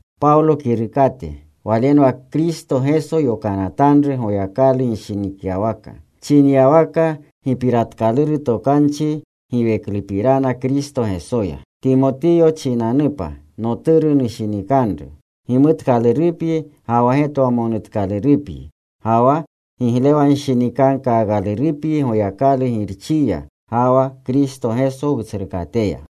Pawlo kirukate. Walenwa Kristo Geso yokanatanru Goyakalu gishinikyawaka, chinyawaka gipiratkaluru tokanchi giweklupirana Kristo Gesoya. Timotiyo chinanupa, noturu nushinikanru. Gimutkalurupyi ga wa getwamonutkalurupyi, ga wa giglewanshinikankaakalurupyi Goyakalu Girchiya, ga wa Kristo Geso Wutsrukateya.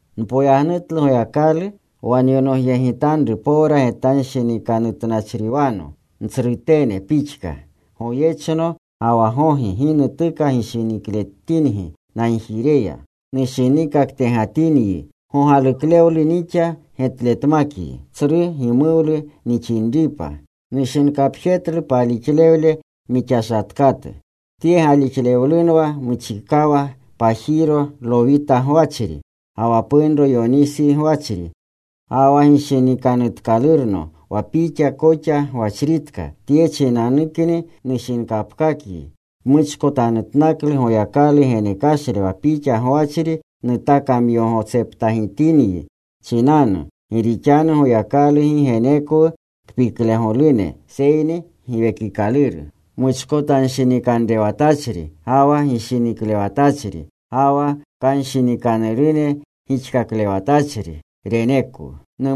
Npoyagnutlu Goyakalu, wa nyonogyegitanru powra getanshinikanutnachriwano ntsrutene pixka, goyechno ga wa gogi gi nutuka gishinikletingi nagjireya. Nushinikaktegatinyi, gogaluklewlu nixa getletmakyi tsru gimuwlu nixinripa. Nushinkapjetlu palixlewle mixashatkatu. Tye galixlewlunwa muchikawa pajiro Lowita gwachri. Ga wa punro Yonisi gwachri. Ga wa gishinikanutkalurno wa pixa koxa gwachritka. Tye chinanukni nushinkapkakyi pmuchkotanutnaklu Goyakalu genekashle wa pixa gwachri nutakamyogogotseptagitinyi chinanu. Gi rixanu Goyakalu gi genekwu kpiklegolunshinikanu, seyni Giwekikaluru muchkotanshinikanrewatachri ga wa gishiniklewlewatachri ga wa kanshinikanurune gixkaklewatachri renekwu.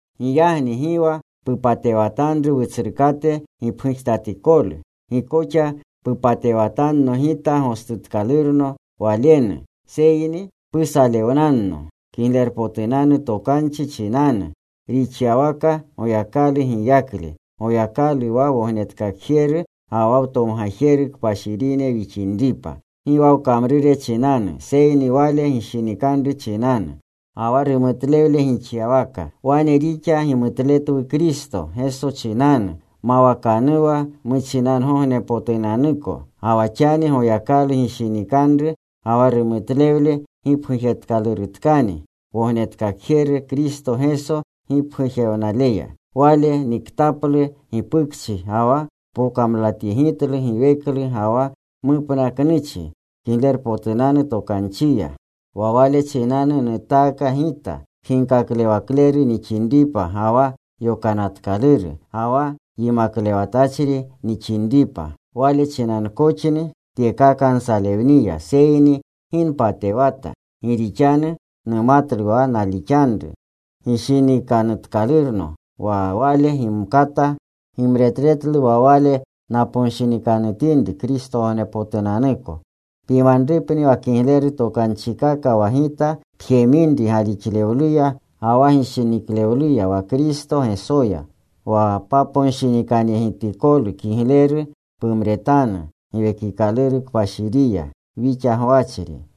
Giyagni gi wa pupatewatanru Wutsrukate gipgujtatikolu. Gi koxa pupatewatanno gita gostutkalurno Walenu. Seyni pusalewnanno Kiglerpotunanu Tokanchi chinanu, rixyawaka Goyakalu giyakle. Goyakalu wa Wognetkakjeru ga wa wtomgajeru kpashirine wixinripa, gi wa wkamrure chinanu, seyni Wale gishinikanru chinanu, ga wa rumutlewle gixyawaka. Wane rixa gimutletwu Kristo Geso chinanu mawakanuwa muchinangognepotunanuko. Ga wa xani Goyakalu gishinikanru ga wa rumutlewle gipgujetkalurutkani Wognetkakjeru Kristo Geso gipgujewnaleya. Wale niktaplu gipukchi ga wa pokamlatyegitlu giweklu ga wa mupnaknuchi Kiglerpotunanu Tokanchiya. Wa wale chinanu nutaaka gita, kginkaklewakleru nixinripa, ga wa yokanatkaluru, ga wa yimaklewatachri nixinripa. Wale chinankoxni tyekaka nsalewniya. Seyni gi npatewata. Gi rixanu numatlu wa nalixanru. Gishinikanutkalurno wa Wale gimkata gimretletlu wa Wale naponshinikanutinri Kristogognepotunanuko. Pyimanrupni wa kigleru tokanchikaka wa gita pjeminri galixlewluya ga wa gishiniklewluya wa Kristo Gesoya. Wa paponshinikanyegitikolu kigleru pumretanu Giwekikaluru Kpashiriya, wixa gwachri.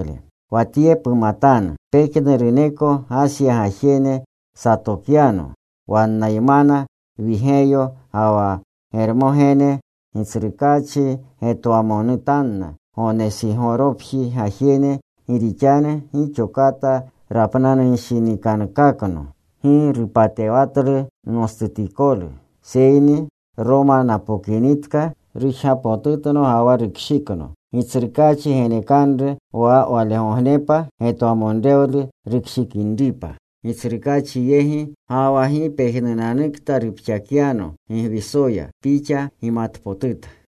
Wa tye pumatanu. Pejnuruneko Gasya gajene satokyano. Wannaymana Wigeyo ga wa Germogene. Gitsrukaachi getwamonutanna Gonesigoropji gajene. Gi rixanu gixo kata rapnanunshinikankakno. Gi rupatewatlu nostutikolu. Seyni Roma rapokinitka rujgapotutno ga wa rukshikno. Gitsrukaachi genekanru wa walegognepa getwamonrewlu rukshikinripa Gitsrukaachi yegi. Ga wa gi pejnunanukta rupxakyano Gigwisoya, pixa gimatpotuta.